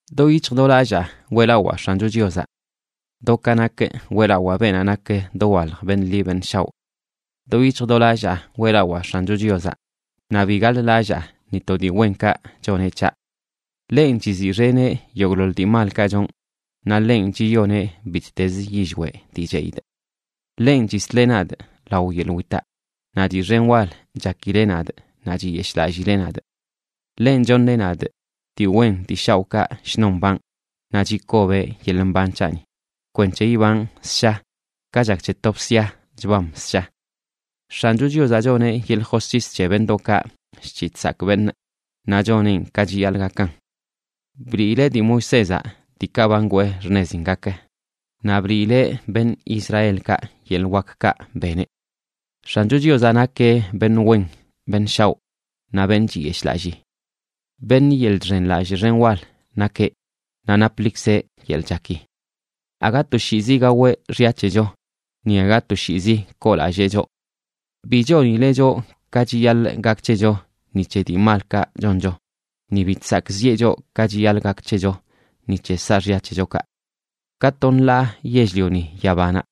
Do yic̱hj do lallaa weꞌlawaa X̱ancho Chiozaꞌ, do ka nakꞌ weꞌlawaa beenaꞌ nak dowalj beṉꞌ ḻi beṉꞌ shaoꞌ. Do yic̱hj do lallaa weꞌlawaa X̱ancho Chiozaꞌ; naꞌ bi gaḻ-lallaa ni to dii wenkaꞌ choneꞌ c̱haꞌ. Ḻenꞌ chiziꞌxeneꞌ yogꞌḻoḻ dii malkaꞌ chonꞌ, naꞌ ḻenꞌ chiyoneꞌ bittezə yillweꞌ dii cheꞌidꞌ. Ḻenꞌ chisleꞌ nadꞌ lao yeḻꞌ witaꞌ, naꞌ dii xen wal chakileꞌ nadꞌ naꞌ chiyeshꞌlallileꞌ nadꞌ. Ḻenꞌ choṉeꞌ nadꞌ dii wen dii shaoꞌkaꞌ shnon mbanꞌ, naꞌ chikobeꞌ yeḻꞌ mban c̱haꞌni kwenc̱he ibanꞌ ssha, ka chak c̱he to bsia chbam ssha. X̱ancho Chiozaꞌ choneꞌ yeḻꞌ josc̱his c̱he beṉꞌdoꞌkaꞌ chc̱hiꞌ chsakꞌ beṉꞌ, naꞌ choneꞌn ka chiyaḻꞌ gakan. Bliileꞌ dii Moisézaꞌ diikaꞌ ba ngwee xṉezin gak, naꞌ bliileꞌ beṉꞌ Israelkaꞌ yeḻꞌ wakkaꞌ beneꞌ. X̱ancho Chiozaꞌ nakeꞌ beṉꞌ wen beṉꞌ shaoꞌ naꞌ beṉꞌ chiyeshꞌlallii. Beṉꞌ yeḻꞌ chxenlallꞌ xen wal nakeꞌ, naꞌ naplikzeꞌ yeḻꞌ chaki. Aga toshiizi gaweꞌ xya c̱hecho, ni aga toshiizi koolallee choꞌ. Bi chonileꞌ choꞌ ka chiyaḻꞌ gak c̱hecho ni c̱he dii malkaꞌ choncho; ni bi chsakꞌziꞌe choꞌ ka chiyaḻꞌ gak c̱hecho ni c̱he saaxya c̱hechokaꞌ. Ka to nḻaa yell-lioni yabanaꞌ,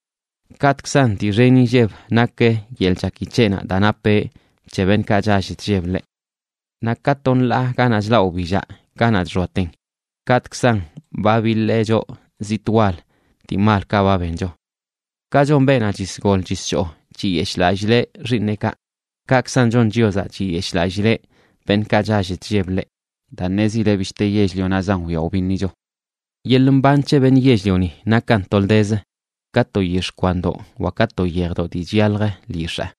kaꞌtꞌkzan dii xen inlleb nak yeḻꞌ chaki c̱heꞌnaꞌ daa napeꞌ c̱he beṉꞌkaꞌ chall chlleb ḻeꞌ. Naꞌ ka to nḻaa ganaꞌ chlaꞌ wbillaꞌ ganaꞌ chxoaten, kaꞌtꞌkzan ba biḻee choꞌ zitꞌ wal dii malkaꞌ ba bencho. Ka chon beenaꞌ chisgol chischoo, chiyeshꞌlallileꞌ xiiṉeꞌkaꞌ, kaꞌkzan chon Chiozaꞌ, chiyeshꞌlallileꞌ beṉꞌkaꞌ chall chlleb ḻeꞌ, daa ṉezileꞌ bishte yell-lionaꞌzan wyaa wbiṉicho. Yeḻꞌ mban c̱he beṉꞌ yell-lioni nakan toldezə ka to yix̱ꞌ kwandoꞌ wa ka to yejdoꞌ dii chyalj lyix̱aa.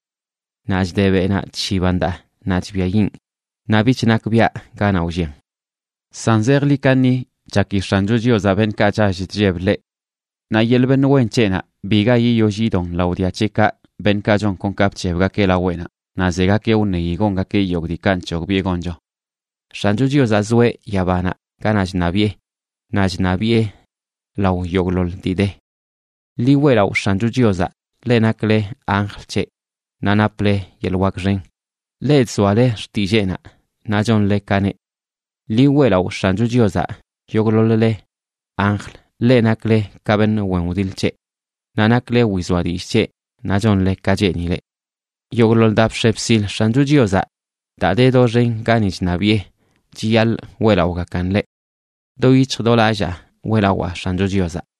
Naꞌ chde beꞌnaꞌ chshiban daa, naꞌ chbiayiꞌn, ni bich nakbiaꞌ ganaꞌ wllian. San zejḻi kaṉi chaki X̱ancho Chiozaꞌ beṉꞌkaꞌ chall chlleb ḻeꞌ. Naꞌ yeḻꞌ beṉꞌ wen c̱heꞌnaꞌ biga yiyoll yidon lao dia c̱heꞌkaꞌ, beṉꞌkaꞌ chon kon ka bc̱hebgakeꞌ laweꞌnaꞌ, naꞌ zegakeꞌ wṉeyi gongakeꞌ yogꞌ diikaꞌ nc̱hogbiꞌe goncho. X̱ancho Chiozaꞌ zoeꞌ yabanaꞌ ganaꞌ chṉabiꞌe, naꞌ chṉabiꞌe lao yogꞌḻoḻ dii de. ¡Ḻi weꞌlaꞌo X̱ancho Chiozaꞌ, leꞌ nakle anjl c̱heꞌ, naꞌ naple yeḻꞌ wak xen, leꞌ chzoale xtilleenaꞌ naꞌ chonle ka neꞌ! Ḻi weꞌlaꞌo X̱ancho Chiozaꞌ, yogꞌḻoḻ-le anjl, leꞌ nakle ka beṉꞌ wen wdiḻ c̱heꞌ, naꞌ nakle wizoa dillꞌ c̱heꞌ naꞌ chonle ka cheenileꞌ. Yogꞌḻoḻ daa bx̱e bsil X̱ancho Chiozaꞌ daa de doxen gani chṉabiꞌe chiyaḻꞌ weꞌlaꞌogakan ḻeꞌ. Do yic̱hj do lallaa weꞌlawaa X̱ancho Chiozaꞌ.